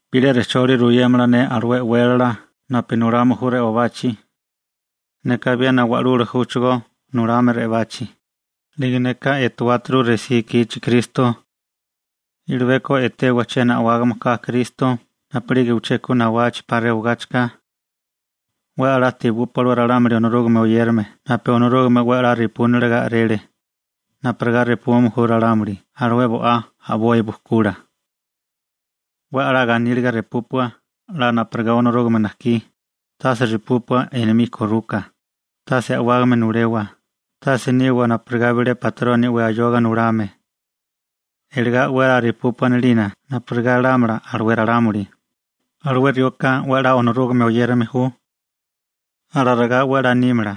Bilé rejcholi ruyémala ne alué e'wélala napu nulame ju re'obachi. Neka abiena wa'lula júchigó nulame re'obachi, 'lige neka etuáturu resí ikichi Kristo. I'libeko etewa chiena a'wágame ka Kristo napu'lige uché ku nawachi 'pa rewagáchika. 'We 'la tebúpua alué ralámuli Onorúgame oyérame napu Onorúgame 'we 'la repúniliga a'rele, napurigá repume ju ralámuli alué bo'á a'boi bujkula. 'We 'la ganíliga repúpua 'la napurigá Onorúgame najkí, tase repúpua enomí koruka, tase a'wágame nulewa, tase niwa napurigá bilé batroni 'we ayoga nulame. Iligá 'we 'la repúpua a'nalina napurigá lámala alué ralámuli: «Alué rioka 'we 'la Onorúgame oyérame ju.» Alarigá 'we 'la nímala.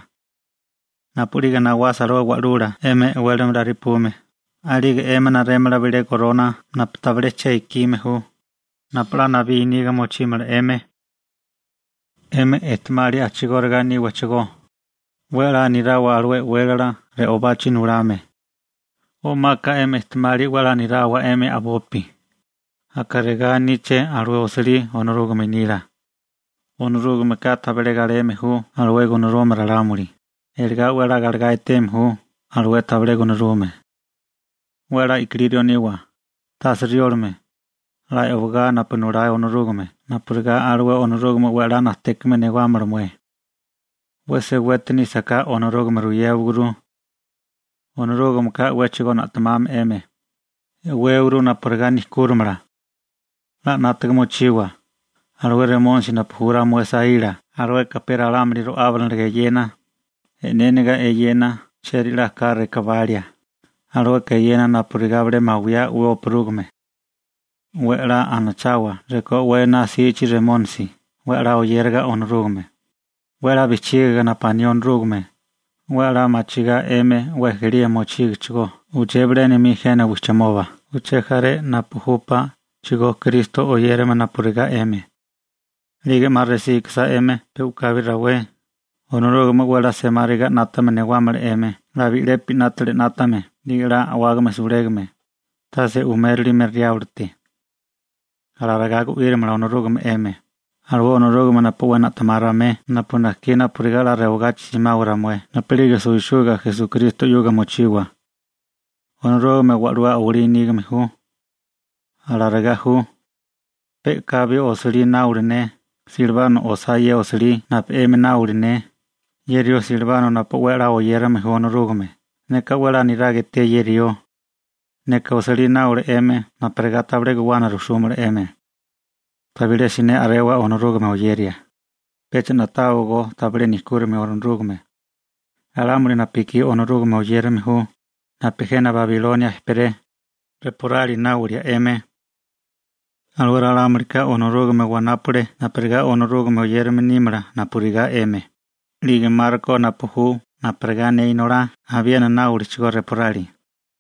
Napu'lige nawasa alué wa'lula 'emi e'wélala repume, a'lige 'emi narémala bilé gorona napu tabilé che ikime ju, napu 'la nabí niga mochímala 'emi. 'Emi ejtemali a'chigóriga níwachigó, 'we 'la nirawa alué e'wélala re'obachi nulame, o'maka 'emi ejtemali 'we 'la nirawa 'emi a'bopi, aka regá aníché alué osilí Onorúgame nila: Onorúgameka tabilé galeme ju alué gunarume ralámuli, iligá 'we la galegá eteme ju alué tabilé gunarume. 'We 'la i'kilí rió niwa, tase riólame, 'la e'wagá napu nulá Onorúgame napurigá alué Onorúgame 'we 'la najtékame newámala mué. 'We seweti nísaká Onorúgame ruyéwaguru. Onorúgameka 'wéchigo na'temame 'emi, e'wéwagurú napurigá nejkúrimala. 'La 'nátaga mochiwa, alué Remónisi napu ju ramué saíla, alueka pe ralámuli ro'ábiniliga eyena, e'néniga eyena chieri 'la ka rekabalia, alueka eyena napurigá bilé mawiyá 'we opurúgime. 'We 'la anachawa rekó 'we ená 'sichi Remónisi, 'we 'la oyériga Onorúgame, 'we 'la bijchígiga napu aní Onorúgame, 'we 'la machigá 'emi 'we ejelía mochígochigó uché bilénami jena wijchimoba uché jaré napu júpáchigó Kristo oyérame napurigá 'emi. 'Lige 'ma resí ikisá 'emi pe u'kabi rawé, Onorúgame 'we 'la semáriga 'nátame newámala 'emi 'la bi'lepi 'nátili 'nátame 'lige 'la a'wágame sulégame, tase umérilime Riáblote. Alarigá gu'írimala Onorúgame 'emi, alué Onorúgame napu 'we na'temá ramué napu najkí napurigá 'la rewagachi simawa ramué napu'lige suwisuga Esukristo 'yuga mochiwa. Onorúgame wa'lú a'walí nígame ju. Alarigá ju. Pe u'kabi osilí náola ne, Silbano osá ye osilí napu 'emi náola ne, ye rió Silbano napu 'we 'la oyérame ju Onorúgame. Neka 'we 'la niraga eté ye rió Silbano. Neka osilí náola 'emi napurigá tabilé guwana rujsúmala 'emi. Tabilé siné a'rewa Onorúgame oyeria. Pecha na'táwagó tabilé nejkúrimio Onorúgame. Ralámuli napu ekí Onorúgame oyérame ju, napu jena Babilonia ejperé, reporali náwalia 'emi. Alué ralámulika Onorúgame wanápale napurigá Onorúgame oyérame nímala napurigá 'emi, 'lige Marko napu ju napurigá ne inolá abiena náwaliachigó reporali.